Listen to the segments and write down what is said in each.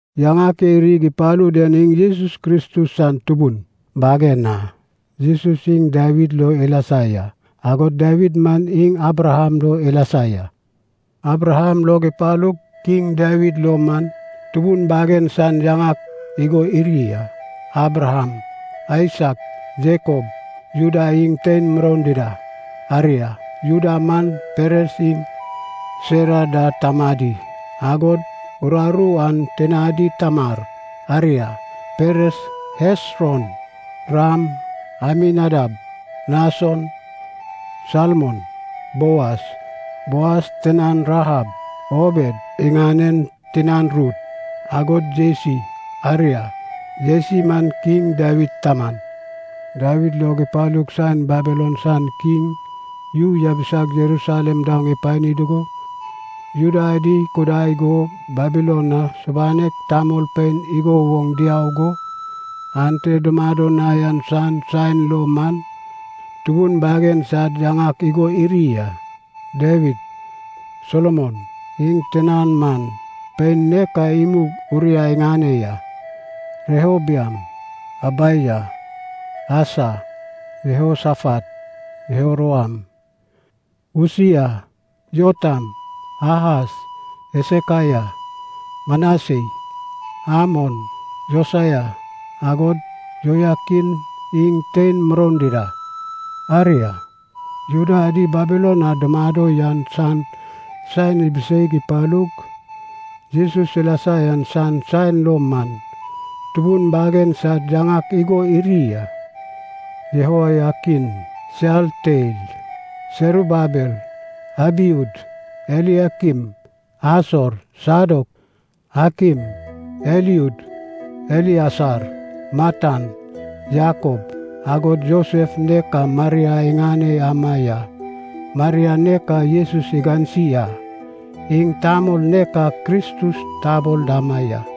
Yaŋak e irig ipalu den iŋ Jesus Kristus san tubun bagen a. Jesus iŋ Dawid lo ilasa ya, agod Dawid man iŋ Abraham lo ilasa ya. Abraham log ipalug Kiŋ Dawid lo man, tubun bagen san yaŋak igo iri a: Abraham, Aisak, Jakob, Juda iŋ tein muroun dida. Aria, Juda man Peres iŋ Serah da tamadi, agod uraru an tinadi Tamar. Aria, Peres, Hesron, Ram, Aminadab, Nason, Salmon, Boas (Boas tinan Rahab), Obed (iŋanen tinan Rut), agod Jesi. Aria, Jesi man Kiŋ Dawid taman. Dawid log ipalug saen Babilon san kiŋ yu yabisag Jerusalem daoŋ ipani dugo, Juda adi ikudai go Babilon na subanek tamolpein igo woŋ diau go ante dumado na yan san saen lo man, tubun bagen sad yaŋak igo iri a: Dawid, Solomon (iŋ tinan man, pein nek a imug Uraya iŋane ya), Rehoboam, Abijah, Asa, Jehosafat, Jehoram, Usia, Jotam, Ahas, Hesekaya, Manasei, Amon, Josaya, agod Jehoyakin iŋ tein muroun dida. Aria, Juda adi Babilon na dumado yan san saen ibiseig ipalug, Jesus ilasa yan san saen lo man, tubun bagen sad yaŋak igo iri a: Jehoyakin, Sealtiel, Serubabel, Abiud, Eliakim, Asor, Sadok, Akim, Eliud, Eliasar, Matan, Jakob, agod Josef nek a Maria iŋane ama ya. Maria nek a Jesus igansi a, iŋ tamol nek a Kristus tabol dama ya.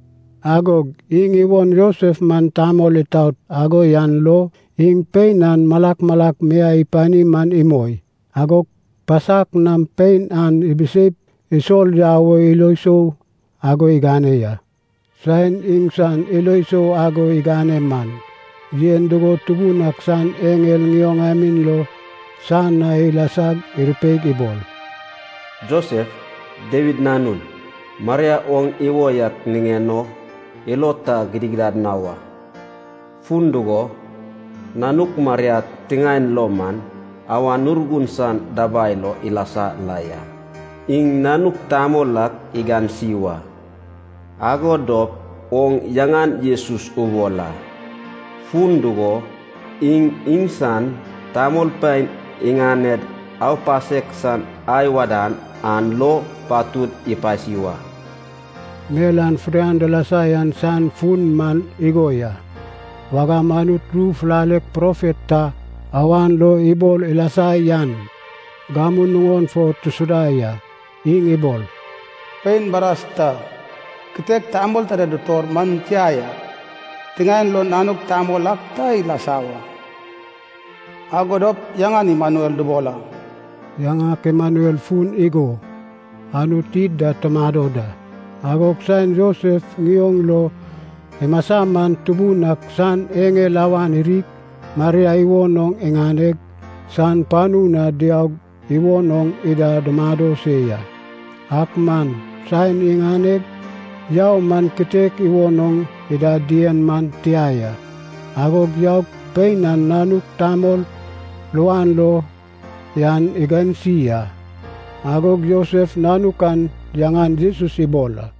Agog iŋ iwon Josef man tamol itaot ago yan lo iŋ pein an malak malak miai ipani man imoi, agog pasak nam pein an ibiseip isol yau o ilo sou ago igane ya. Saen iŋsan ilo sou ago igane man, yen dugo Tubun ak san eŋel ŋioŋamin lo san na ilasag irupeig ibol, “Josef, Dawid nanun, Maria oŋ iwo yak ŋiŋen o ilo ta gidigidad na wa, fun dugo, nanuk Maria tiŋaen lo man Awan Urgun san dabai lo ilasa la ya. Iŋ nanuk tamol ak igansi wa, ago dop oŋ yaŋan Jesus ubol a, fun dugo, iŋ iŋsan tamolpein iŋaned aupasek san ai wadan an lo patud ipasi wa.” Mel an fidian dilasa yan san fun man igo ya, wagam Anut ru fulalek profet ta awan lo ibol ilasa yan gamu nuŋon fo tusuda ya. Iŋ ibol, “Pein baras ta kitek tamol ta da dutor man tia yak, tiŋaen lo nanuk tamol ak ta ilasa wa. Ago dop yaŋan Imanuel dubol a.” (Yaŋak Imanuel fun man igo: “Anut id da tumado da.”) Agog saen Josef ŋioŋ lo imasa man Tubun ak san eŋel awan irig, Maria iwon oŋ iŋaneg san panu na diaug iwon oŋ ida dumado se ya. Ak man saen iŋaneg yau man kitek iwon oŋ ida dien man tia ya, agog yaug pein an nanuk tamol luan lo yan igansi a. Agog Josef nanuk an yaŋan Jesus ibol a.